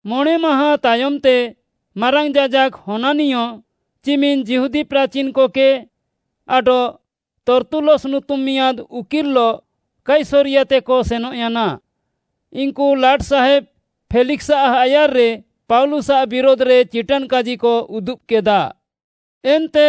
ମଣେଁ ମାହାଁ ତାୟମ୍‌ତେ ମାରାଙ୍ଗ୍‌ ଯାଜାକ୍‌ ହନାନିୟ, ଚିମିନ୍‌ ଯିହୁଦୀ ପ୍ରାଚିନ୍‌କକେ ଆଡଃ ତର୍ତ୍ତୁଲସ୍‌ ନୁତୁମ୍‌ ମିଆଁଦ୍‌ ଓକିଲ୍‌ଲଃ କାଇସରିୟାତେକ ସେନଃୟାନା। ଇନ୍‌କୁ ଲାଟ୍‌ସାହେବ୍‌ ଫେଲିକ୍‌ସ୍‌ଆଃ ଆୟାର୍‌ରେ ପାଉଲୁସ୍‌ଆଃ ବିରୁଧ୍‌ରେ ଚିଟାନ୍‌କାଜିକ ଉଦୁବ୍‌କେଦା। ଏନ୍ତେ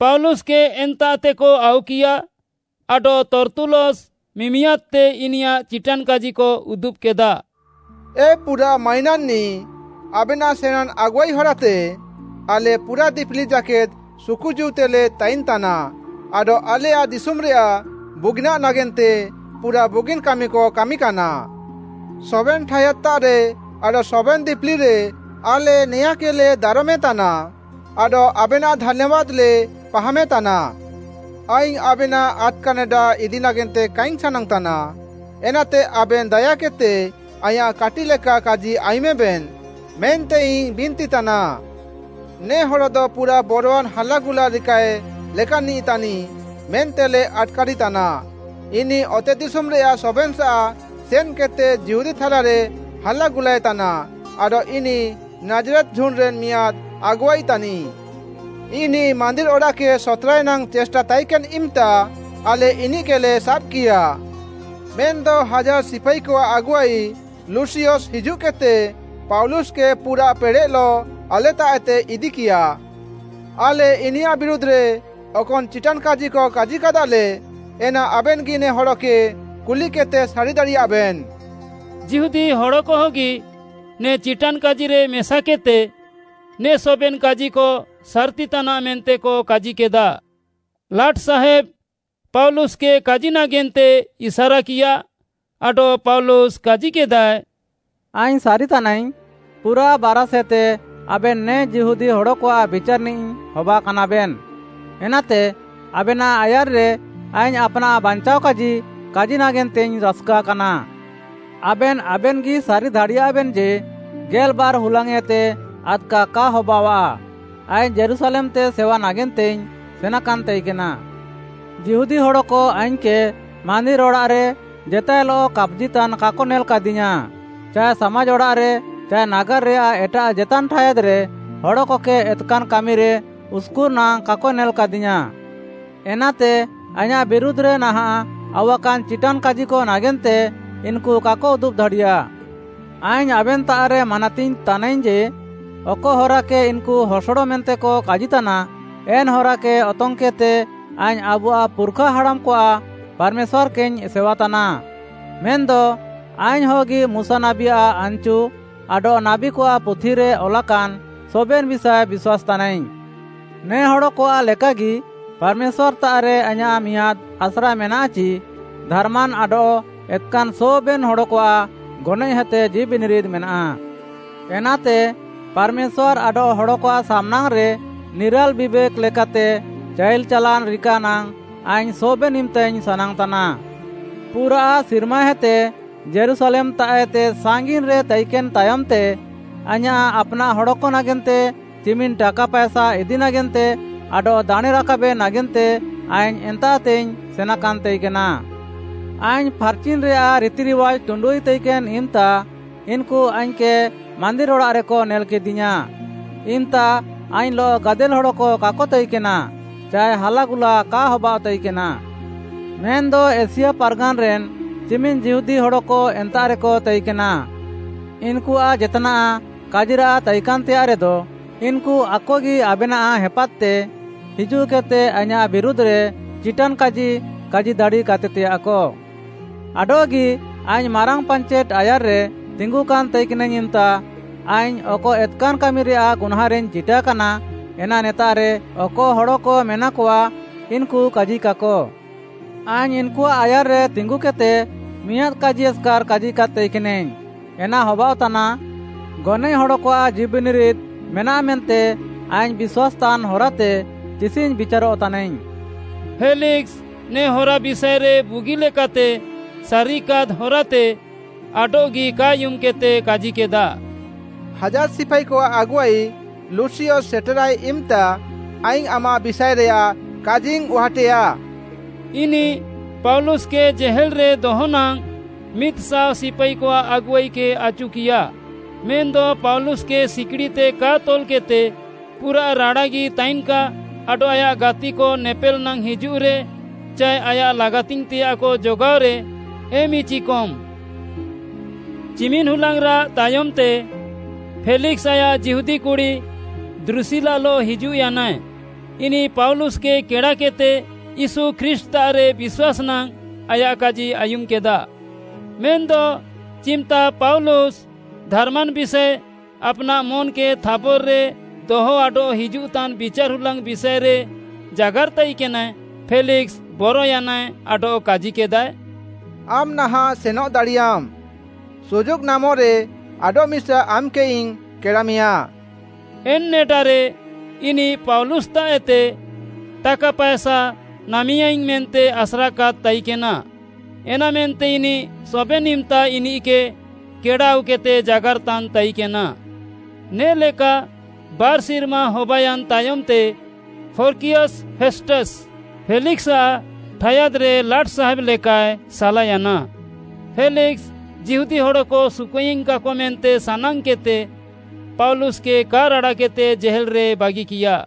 ପାଉଲୁସ୍‌କେ ଏନ୍ତାଃତେକ ଆଉକିୟା ଆଡଃ ତର୍ତ୍ତୁଲସ୍‌ ମିମିଆଦ୍‌ତେ ଇନିୟାଃ ଚିଟାନ୍‌କାଜିକ ଉଦୁବ୍‌କେଦା, “ଏ ପୁରାଃ ମାଇନାନ୍‌ନିଃ, ଆବେନାଃ ସେଣାଁନ୍‌ ଆଗୁଆଇ ହରାତେ ଆଲେ ପୁରାଃ ଦିପିଲି ଜାକେଦ୍‌ ସୁକୁଜୀଉତେଲେ ତାଇନ୍‌ତାନା, ଆଡଃ ଆଲେୟାଃ ଦିଶୁମ୍‌ରେୟାଃ ବୁଗିନାଃ ନାଗେନ୍ତେ ପୁରାଃ ବୁଗିନ୍‌ କାମିକ କାମିକାନା। ସବେନ୍‌ ଠାୟାଦ୍‌ତାଃରେ ଆଡଃ ସବେନ୍‌ ଦିପିଲିରେ ଆଲେ ନେଆଁକେଲେ ଦାରମେତାନା, ଆଡଃ ଆବେନାଃ ଧାନ୍ୟାବାଦ୍‌ଲେ ପାହାମେତାନା। ଆଇଙ୍ଗ୍‌ ଆବେନାଃ ଆଦ୍‌କା ନେଡା ଇଦି ନାଗେନ୍ତେ କାଇଙ୍ଗ୍‌ ସାନାଙ୍ଗ୍‌ତାନା, ଏନାତେ ଆବେନ୍‌ ଦାୟାକେଦ୍‌ତେ ଆଇଁୟାଃ କାଟିଃଲେକା କାଜି ଆୟୁମେବେନ୍‌ ମେନ୍ତେଇଙ୍ଗ୍‌ ବିନ୍ତିତାନା। ନେ ହଡ଼ଦ ପୁରାଃ ବରୱାନ୍‌ ହାଲାଗୁଲା ରିକାଏ ଲେକାନ୍‌ନିଃ ତାନିଃ ମେନ୍ତେଲେ ଆଟ୍‌କାରିତାନା, ଇନିଃ ଅତେଦିଶୁମ୍‌ରେୟାଃ ସବେନ୍‌ସାଃ ସେନ୍‌କେଦ୍‌ତେ ଯିହୁଦୀ ଥାଲାରେ ହାଲାଗୁଲାଏ ତାନା ଆଡଃ ଇନିଃ ନାଜ୍‌ରେତ୍‌ ଝୁଣ୍ଡ୍‌ରେନ୍‌ ମିଆଁଦ୍‌ ଆଗୁଆଇ ତାନିଃ। ଇନିଃ ମାନ୍ଦିର୍‌ ଅଡ଼ାଃକେ ସତ୍‌ରାଏ ନାଙ୍ଗ୍‌ ଚେଷ୍ଟା ତାଇକେନ୍‌ ଇମ୍‌ତା ଆଲେ ଇନିଃକେଲେ ସାବ୍‍କିୟା। ମେନ୍‌ଦ ହାଜାର୍‍ ସିପାଇକଆଃ ଆଗୁଆଇ ଲୁସିୟସ୍‌ ହିଜୁଃକେଦ୍‌ତେ ପାଉଲୁସ୍‌କେ ପୁରାଃ ପେଡ଼େଃଲଃ ଆଲେତାଃଏତେ ଇଦିକିୟା। ଆଲେ ଇନିୟାଃ ବିରୁଧ୍‌ରେ ଅକନ୍‌ ଚିଟାନ୍‌କାଜିକ କାଜିକାଦାଲେ, ଏନା ଆବେନ୍‌ଗି ନେ ହଡ଼କେ କୁଲିକେଦ୍‌ତେ ସାରି ଦାଡ଼ିୟାଃବେନ୍‌।” ଯିହୁଦୀ ହଡ଼କହଗି ନେ ଚିଟାନ୍‌କାଜିରେ ମେସାକେଦ୍‌ତେ ନେ ସବେନ୍‌ କାଜିକ ସାର୍‌ତିତାନାଃ ମେନ୍ତେକ କାଜିକେଦା। ଲାଟ୍‌ସାହେବ୍‌ ପାଉଲୁସ୍‌କେ କାଜି ନାଗେନ୍ତେ ଇସାରାକିୟା, ଆଡଃ ପାଉଲୁସ୍‌ କାଜିକେଦାଏ, “ଆଇଙ୍ଗ୍‌ ସାରି ତାନାଇଙ୍ଗ୍‌, ପୁରାଃ ବାରାଷ୍‌ହେତେ ଆବେନ୍‌ ନେ ଯିହୁଦୀ ହଡ଼କଆଃ ବିଚାର୍‌ନିଃ ହବାକାନାବେନ୍‌, ଏନାତେ ଆବେନାଃ ଆୟାର୍‌ରେ ଆଇଙ୍ଗ୍‌ ଆପ୍‌ନାଃ ବାଞ୍ଚାଅଃକାଜି କାଜି ନାଗେନ୍ତେଇଙ୍ଗ୍‌ ରାସ୍‌କା କାନା। ଆବେନ୍‌ ଆବେନ୍‌ଗି ସାରି ଦାଡ଼ିୟାଃବେନ୍‌ ଯେ, ଗେଲ୍‌ବାର୍‌ ହୁଲାଙ୍ଗ୍‌ଏତେ ଆଦ୍‌କା କା ହବାଅଃଆ ଆଇଙ୍ଗ୍‌ ଯୀରୁଶାଲେମ୍‌ତେ ସେୱା ନାଗେନ୍ତେଇଙ୍ଗ୍‌ ସେନାକାନ୍‌ ତାଇକେନା। ଯିହୁଦୀ ହଡ଼କ ଆଇଙ୍ଗ୍‌କେ ମାନ୍ଦିର୍‌ ଅଡ଼ାଃରେ ଜେତାଏଲଃ କାପ୍‌ଜିତାନ୍‌ କାକ ନେଲାକାଦିୟାଁ ଚାଏ ସାମାଜ୍‌ ଅଡ଼ାଃରେ ଚାଏ ନାଗାର୍‌ରେୟାଃ ଏଟାଃ ଜେତାନ୍‌ ଠାୟାଦ୍‌ରେ ହଡ଼କକେ ଏତ୍‌କାନ୍‌ କାମିରେ ଉସ୍‌କୁର୍‌ ନାଙ୍ଗ୍‌ କାକ ନେଲାକାଦିୟାଁ। ଏନାତେ ଆଇଁୟାଃ ବିରୁଧ୍‌ରେ ନାହାଁଃ ଆଉୱାକାନ୍‌ ଚିଟାନ୍‌କାଜିକ ନାଗେନ୍ତେ ଇନ୍‌କୁ କାକ ଉଦୁବ୍‌ ଦାଡ଼ିୟା। ଆଇଙ୍ଗ୍‌ ଆବେନ୍‌ତାଃରେ ମାନାତିଙ୍ଗ୍‌ ତାନାଇଙ୍ଗ୍‌ ଯେ ଅକ ହରାକେ ଇନ୍‌କୁ ହସଡ଼ ମେନ୍ତେକ କାଜିତାନା, ଏନ୍‌ ହରାକେ ଅତଙ୍ଗ୍‌କେଦ୍‌ତେ ଆଇଙ୍ଗ୍‌ ଆବୁଆଃ ପୁର୍‌ଖା ହାଡ଼ାମ୍‌କଆଃ ପାର୍‌ମେଶ୍ୱାର୍‌କେଇଙ୍ଗ୍‌ ସେୱାତାନା। ମେନ୍‌ଦ ଆଇଙ୍ଗ୍‌ହଗି ମୁଶା ନାବୀଆଃ ଆନ୍‌ଚୁ ଆଡଃ ନାବୀକଆଃ ପୁଥିରେ ଅଲାକାନ୍‌ ସବେନ୍‌ ବିଷାଏ ବିଶ୍ୱାସ୍‌ତାନାଇଙ୍ଗ୍‌। ନେ ହଡ଼କଆଃ ଲେକାଗି ପାର୍‌ମେଶ୍ୱାର୍‌ତାଃରେ ଆଇଁୟାଃ ମିଆଁଦ୍‌ ଆସ୍ରା ମେନାଃ ଚି, ଧାର୍‌ମାନ୍‌ ଆଡଃ ଏତ୍‌କାନ୍‌ ସବେନ୍‌ ହଡ଼କଆଃ ଗନଏଃହେତେ ଜୀଉବିନିରିଦ୍‌ ମେନାଃ। ଏନାତେ ପାର୍‌ମେଶ୍ୱାର୍‌ ଆଡଃ ହଡ଼କଆଃ ସାମ୍‌ନାଙ୍ଗ୍‌ରେ ନିରାଲ୍‌ ବିବେକ୍‌ ଲେକାତେ ଚାଇଲ୍‌ ଚାଲାନ୍‌ ରିକା ନାଙ୍ଗ୍‌ ଆଇଙ୍ଗ୍‌ ସବେନ୍‌ ଇମ୍‌ତାଇଙ୍ଗ୍‌ ସାନାଙ୍ଗ୍‌ତାନା। “ପୁରାଃ ସିର୍ମାହେତେ ଯୀରୁଶାଲେମ୍‌ତାଃଏତେ ସାଙ୍ଗିନ୍‌ରେ ତାଇକେନ୍‌ ତାୟମ୍‌ତେ, ଆଇଁୟାଃ ଆପ୍‌ନାଃ ହଡ଼କ ନାଗେନ୍ତେ ଚିମିନ୍‌ ଟାକା ପାଏସା ଇଦି ନାଗେନ୍ତେ ଆଡଃ ଦାଣେଁ ରାକାବେ ନାଗେନ୍ତେ ଆଇଙ୍ଗ୍‌ ଏନ୍ତାଃତେଇଙ୍ଗ୍‌ ସେନାକାନ୍‌ ତାଇକେନା। ଆଇଙ୍ଗ୍‌ ଫାର୍‌ଚିନ୍‌ରେୟାଃ ରିତିରିୱାଜ୍‌ ଟୁଣ୍ଡୁଇ ତାଇକେନ୍‌ ଇମ୍‌ତା ଇନ୍‌କୁ ଆଇଙ୍ଗ୍‌କେ ମାନ୍ଦିର୍‌ ଅଡ଼ାଃରେକ ନେଲ୍‌କେଦିୟାଁ। ଇମ୍‌ତା ଆଇଙ୍ଗ୍‌ଲଃ ଗାଦେଲ୍‌ ହଡ଼କ କାକ ତାଇକେନା ଚାଏ ହାଲାଗୁଲା କା ହବାଅଃ ତାଇକେନା। ମେନ୍‌ଦ ଏସିଆ ପାର୍‌ଗାନ୍‌ରେନ୍‌ ଚିମିନ୍‌ ଯିହୁଦୀ ହଡ଼କ ଏନ୍ତାଃରେକ ତାଇକେନା, ଇନ୍‌କୁଆଃ ଜେତ୍‌ନାଃ କାଜିରାଃ ତାଇକାନ୍‌ତେୟାଃ ରେଦ, ଇନ୍‌କୁ ଆକଗି ଆବେନାଃ ହେପାଦ୍‌ତେ ହିଜୁଃକେଦ୍‌ତେ ଆଇଁୟାଃ ବିରୁଧ୍‌ରେ ଚିଟାନ୍‌କାଜି କାଜି ଦାଡ଼ିକାତେତେୟାଃକ। ଆଡଃଗି ଆଇଙ୍ଗ୍‌ ମାରାଙ୍ଗ୍‌ ପାଞ୍ଚେଟ୍‌ ଆୟାର୍‌ରେ ତିଙ୍ଗୁକାନ୍‌ ତାଇକେନାଇଙ୍ଗ୍‌ ଇମ୍‌ତା, ଆଇଙ୍ଗ୍‌ ଅକ ଏତ୍‌କାନ୍‌ କାମିରେୟାଃ ଗୁହ୍ନାଁଁରେଇଙ୍ଗ୍‌ ଚିଟାକାନା, ଏନା ନେତାଃରେ ଅକ ହଡ଼କ ମେନାକଆ, ଇନ୍‌କୁ କାଜିକାକ। ଆଇଙ୍ଗ୍‌ ଇନ୍‌କୁଆଃ ଆୟାର୍‌ରେ ତିଙ୍ଗୁକେଦ୍‌ତେ ମିଆଁଦ୍‌ କାଜି ଏସ୍‌କାର୍‌ କାଜିକାଦ୍‌ ତାଇକେନାଇଙ୍ଗ୍‌, ଏନା ହବାଅଃତାନା, ‘ଗନଏଃ ହଡ଼କଆଃ ଜୀଉବିନିରିଦ୍‌ ମେନାଃ ମେନ୍ତେ ଆଇଙ୍ଗ୍‌ ବିଶ୍ୱାସ୍‌ତାନ୍‌ ହରାତେ ତିସିଙ୍ଗ୍‌ ବିଚାରଃତାନାଇଙ୍ଗ୍‌।’” ଫେଲିକ୍‌ସ୍‌ ନେ ହରା ବିଷାଏରେ ବୁଗିଲେକାତେ ସାରିକାଦ୍‌ ହରାତେ ଆଡଃଗି କା ଆୟୁମ୍‌କେଦ୍‌ତେ କାଜିକେଦା, “ହାଜାର୍‌ ସିପାଇକଆଃ ଆଗୁଆଇ ଲୁସିୟସ୍‌ ସେଟେରାଏ ଇମ୍‌ତା, ଆଇଙ୍ଗ୍‌ ଆମାଃ ବିଷାଏରେୟାଃ କାଜିଇଙ୍ଗ୍‌ ଉହାଟେୟା।” ଇନିଃ ପାଉଲୁସ୍‌କେ ଜେହେଲ୍‌ରେ ଦହ ନାଙ୍ଗ୍‌ ମିଦ୍‌ଶାଅ ସିପାଇକଆଃ ଆଗୁଆଇକେ ଆଚୁକିୟା, ମେନ୍‌ଦ ପାଉଲୁସ୍‌କେ ସିକିଡ଼ିତେ କା ତଲ୍‌କେଦ୍‌ତେ ପୁରା ରାଡ଼ାଗି ତାଇନ୍‌କା ଆଡଃ ଆୟାଃ ଗାତିକ ନେପେଲ୍‌ ନାଙ୍ଗ୍‌ ହିଜୁଃରେ ଚାଏ ଆୟାଃ ଲାଗାତିଙ୍ଗ୍‌ତେୟାଃକ ଜଗାଅରେ, ଏମ୍‌ଇଚିକମ୍‌। ଚିମିନ୍‍ ହୁଲାଙ୍ଗ୍‌ରାଃ ତାୟମ୍‌ତେ ଫେଲିକ୍‌ସ୍‌ ଆୟାଃ ଯିହୁଦୀ କୁଡ଼ି ଦ୍ରୁସିଲାଲଃ ହିଜୁଃୟାନାଏ, ଇନିଃ ପାଉଲୁସ୍‌କେ କେଡ଼ାକେଦ୍‌ତେ ୟୀଶୁ ଖ୍ରୀଷ୍ଟ୍‌ତାଃରେ ବିଶ୍ୱାସ୍‌ ନାଙ୍ଗ୍‌ ଆୟାଃ କାଜି ଆୟୁମ୍‌କେଦା। ମେନ୍‌ଦ ଚିମ୍‌ତା ପାଉଲୁସ୍‌ ଧାର୍‌ମାନ୍‌ ବିଷାଏ, ଆପ୍‌ନାଃ ମନ୍‌କେ ଥାବର୍‌ରେ ଦହ ଆଡଃ ହିଜୁଃତାନ୍‌ ବିଚାର୍‌ ହୁଲାଙ୍ଗ୍‌ ବିଷାଏରେ ଜାଗାର୍‌ ତାଇକେନାଏ, ଫେଲିକ୍‌ସ୍‌ ବରୟାନାଏ ଆଡଃ କାଜିକେଦାଏ, “ଆମ୍‌ ନାହାଁଃ ସେନଃ ଦାଡ଼ିୟାମ୍‌। ସୁଯୋଗ୍‌ ନାମେରେ, ଆଡଃମିସା ଆମ୍‌କେଇଙ୍ଗ୍‌ କେଡ଼ାମେୟାଁ।” ଏନ୍‌ ନେଡାରେ ଇନିଃ ପାଉଲୁସ୍‌ତାଃଏତେ ଟାକା ପାଏସା ନାମେୟାଇଙ୍ଗ୍‌ ମେନ୍ତେ ଆସ୍ରାକାଦ୍‌ ତାଇକେନା, ଏନାମେନ୍ତେ ଇନିଃ ସବେନ୍‌ ଇମ୍‌ତା ଇନିଃକେ କେଡ଼ା ଆଉକେଦ୍‌ତେ ଜାଗାର୍‌ତାନ୍‌ ତାଇକେନା। ନେ'ଲେକା ବାର୍‌ ସିର୍ମା ହବାୟାନ୍‌ ତାୟମ୍‌ତେ ପୋର୍କିୟସ୍‌ ଫେଷ୍ଟସ୍‌, ଫେଲିକ୍‌ସ୍‌ଆଃ ଠାୟାଦ୍‌ରେ ଲାଟ୍‌ସାହେବ୍‌ ଲେକାଏ ସାଲାୟାନା। ଫେଲିକ୍‌ସ୍‌, ଯିହୁଦୀ ହଡ଼କ ସୁକୁଆଇଙ୍ଗ୍‌କାକ ମେନ୍ତେ ସାନାଙ୍ଗ୍‌କେଦ୍‌ତେ ପାଉଲୁସ୍‌କେ କା ରାଡ଼ାକେଦ୍‌ତେ ଜେହେଲ୍‌ରେ ବାଗିକିୟା।